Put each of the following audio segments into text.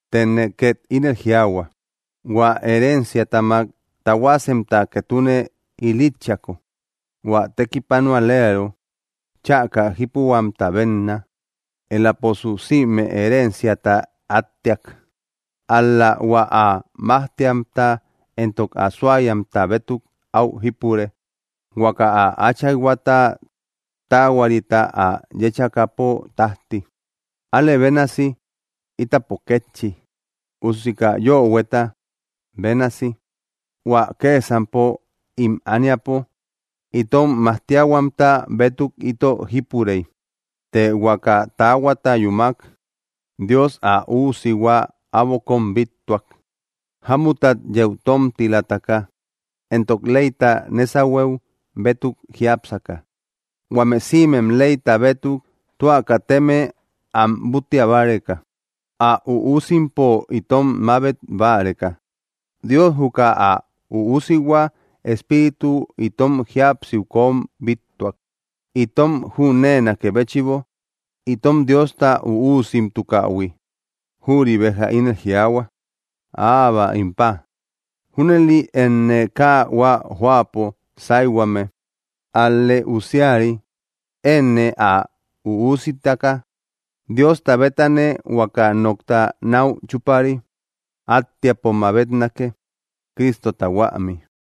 Tëne két ínel jiaahua: Huä herenciatamak tahuasemta ketune ilítchiako, hua tekipanualeero chäka jípuhuamta bénna, elaposu sïme herenciata attiak. Ál‑la hua ä majtiamta éntok ä suayamta bétuk áu jípure, huaka ä áchayhuata taahuarita ä yéchakäpo tájti. Alë bénasi, ítapo kétchi, usi kaa yöhueta bénasi, hua kësampo ím ániapo itom majtiahuamta bétuk ito jípurey. Të huaka taahuata yúmak, Dios ä üusihua äbo kóm bíttuak, jámuttat yeu tómtilataka, éntok leyta nésahueu bétuk jiápsaka, huame sïmem leyta bétuk tua kateme am búttia báreka, ä üusimpo itom mabet báreka. Dios juka ä Üusihua Espíritu itom jíapsiu kom bíttuak, itom jüneenakë béchïbo itom Diosta üusimtukähui; jüri béja ínel jiaahua: “¡Abba, im Pa!” Júnëli enë kaa hua jóapo sáyhuame, ál‑lë usiari; enë ä üusitaka, Diosta bétanë huaka nokta náu chúpari attiapo mabetnake, Cristota huämi.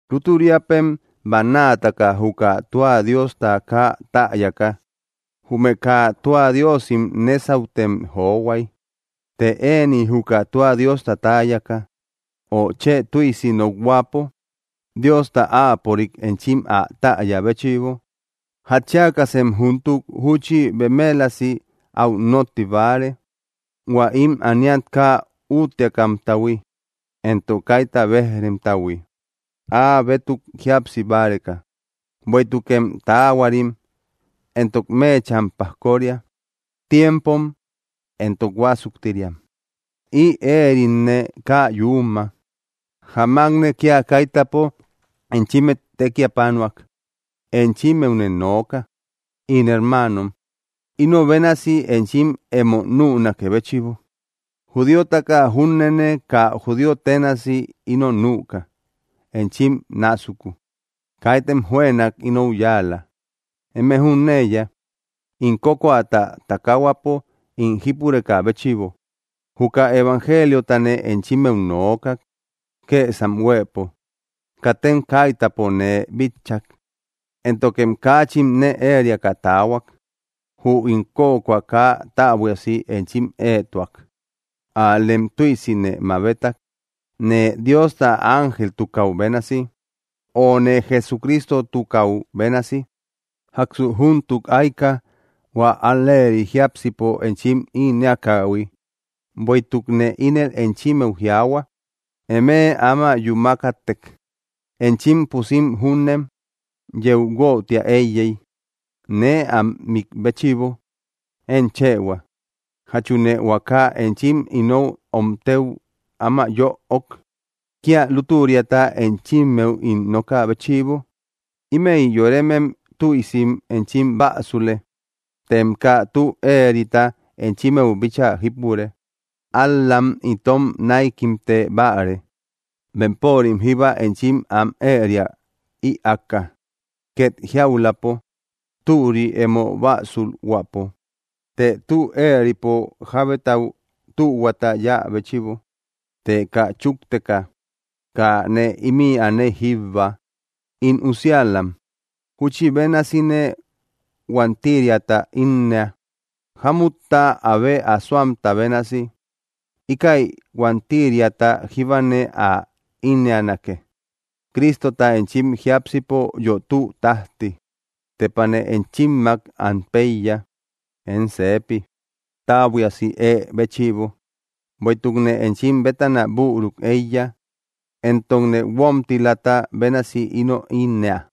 Lútüriapem, bannaataka juka tua Diosta kaa täyaka, jume kaa tua diosim nésautem johuay. Të ëni juka tua Diosta täyaka, ö chë tüisi nokhuäpo, Diosta áapörik enchim ä täya béchïbo, ¿jatchiakasem júntuk júchi bemelasi áu nótti báare, hua ím ániat kaa útteakamtahui éntok kaita béj‑remtahui, áa bétuk jíapsi báreka? ¡Bueïtukem taahuarim éntok meecham pajkoria, tiempom, éntok huásuktiriam! Ï éeritne kaa yuuma: Jamakne kía kaitäpo enchímmet tekipanuak. Enchimmeune nooka, ín hermaanom, ino bénasi enchim emo nünakë béchïbo, judíotaka júnene kaa judío ténasi ino nüka enchim násuku. Kaitem juënak inou yáala. Eme jüneiya, ín kökoata takahuapo ín jípurekä béchïbo, juka evangeliotane enchimmeu nookak, kësam huëpo. Katem kaitäpo nee bitchak, éntokem kaachin nee ériaka taahuak. Jü ín kökoa kaa täbuiasi enchim éetuak; ál‑lem tüisi nee mabetak, nee Diosta ángeltukäu bénasi; o nee Jesucristotukäu bénasi. ¿Jáksu júntuk ayka, hua al‑leeri jiápsipo enchim ínnëakähui? Bueïtukne ínel enchimmeu jiaahua, eme áma yúmakätek enchim pusim júnem yeu guötiä éiyey, nee am mik béchïbo. Én chëhua, ¿jachune huaka enchim inou omtëu áma yöok, kía lútüriata enchimmeu ín nokä béchïbo? Ímëi yoremem tüisim enchim bäsule, tem kaa tü éerita enchimmeu bíchaa jípure. Ál‑lam itom näikimte báare, bempörim jíba enchim am éria ïaaka. Ket jiauläpo, türi emo bäsulhuäpo, të tü éeripo jábetau tühuata yáa béchïbo; të kaa chúkteka, kaa nee ímï aney jíbba. In usiälam, júchi bénasine huantiriata ínnëa, jámutta abe asoamta bénasi; íkäi huantiriata jíbane ä ínnënake, Cristota enchim jiápsipo yötüu tájti. ¡Tepane enchimmak an péiya, én seepi, täbuiasi ée béchïbo, bueïtukne enchim bétana büruk éiya, éntokne guómtilata bénasi ino ínnëa!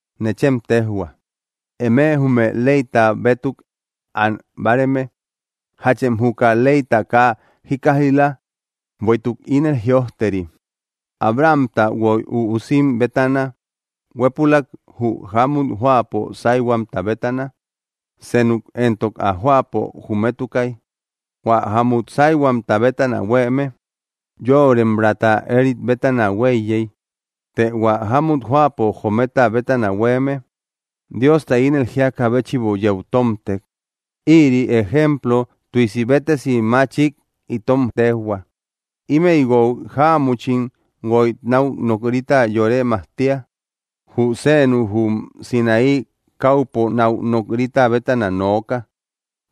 Nechem téjhua, eme jume leyta bétuk an báareme: ¿Jachem juka leyta kaa jíkkaij‑la? Bueïtuk ínel jïojteri, Abrahamta guoy üusim bétana: huépülak jü jámut jóapo sáyhuamta bétana, senuk entok ä jóapo jometukay. Huä, jámut sáyhuamta bétana huéeme, yoremraata éerit bétana huéiyey; të hua, jámut jóapo jometa bétana huéeme, Diosta ínel jíakä béchïbo yeu tómtek. Ïri ejemplo tüisi béttesi machik itom téjhua; ímëi guoy jáamuchim guoy náu nok‑rita yore majtia. Jü seenu jum Sinaí káupo náu nok‑rita bétana nooka;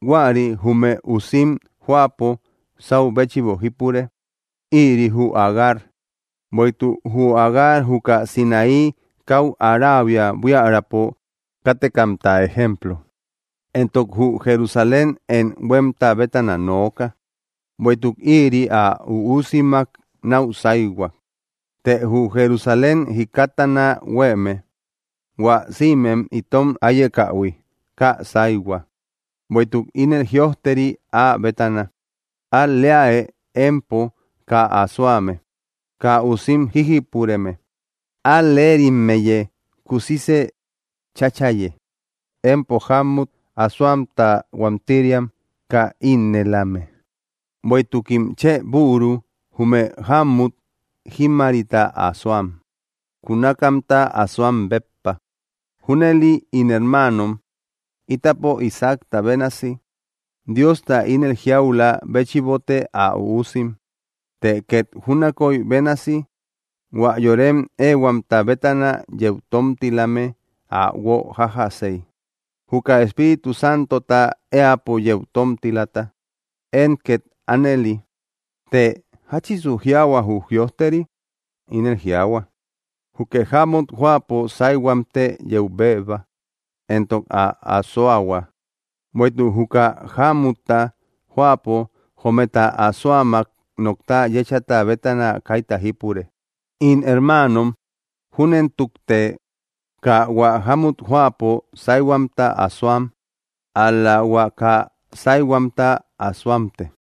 huäri jume usim jóapo sáu béchïbo jípure; ïri jü Agar. Bueïtuk jü Agar juka Sinaí káu Araabia buiärapo kátekamta ejemplo, éntok jü Jerusalén én huémta bétana nooka, bueïtuk ïri ä üusimmak náu sáyhua. Të jü Jerusalén jikattana huéeme, hua sïmem itom áyekähui, kaa sáyhua. Bueïtuk ínel jïojteri áa bétana: Al‑leäe, empo kaa asoame, kaa usim jíjipureme; al‑lerimmeyë kusisë cháchaye, empo jámmut asoamta huántiriam kaa ínnëlame; bueïtukim chë büru jume jámut jímmarita asoam, kunakamta asoam béppa. Júnëli, ín hermaanom, ítapo Isaacta bénasi, Diosta ínel jiaulä béchïbote ä üusim. Të két júnakoy bénasi hua yorem éehuamta bétana yeu tómtilame ä guo jájjasey, juka Espíritu Santota éäpo yeu tómtilata; én két ánëli. Të, ¿jáchisu jiaahua jü jïojteri? Ínel jiaahua: “Jukë jámut jóapo sáyhuamtë yeu béeba, éntok ä asoahua, bueïtuk juka jámutta jóapo jometa asoammak nokta yéchata bétana kaita jípure.” In hermaanom, júnentukte kaa hua jámut jóapo sáyhuamta asoam, ál‑la hua kaa sáyhuamta asoamte.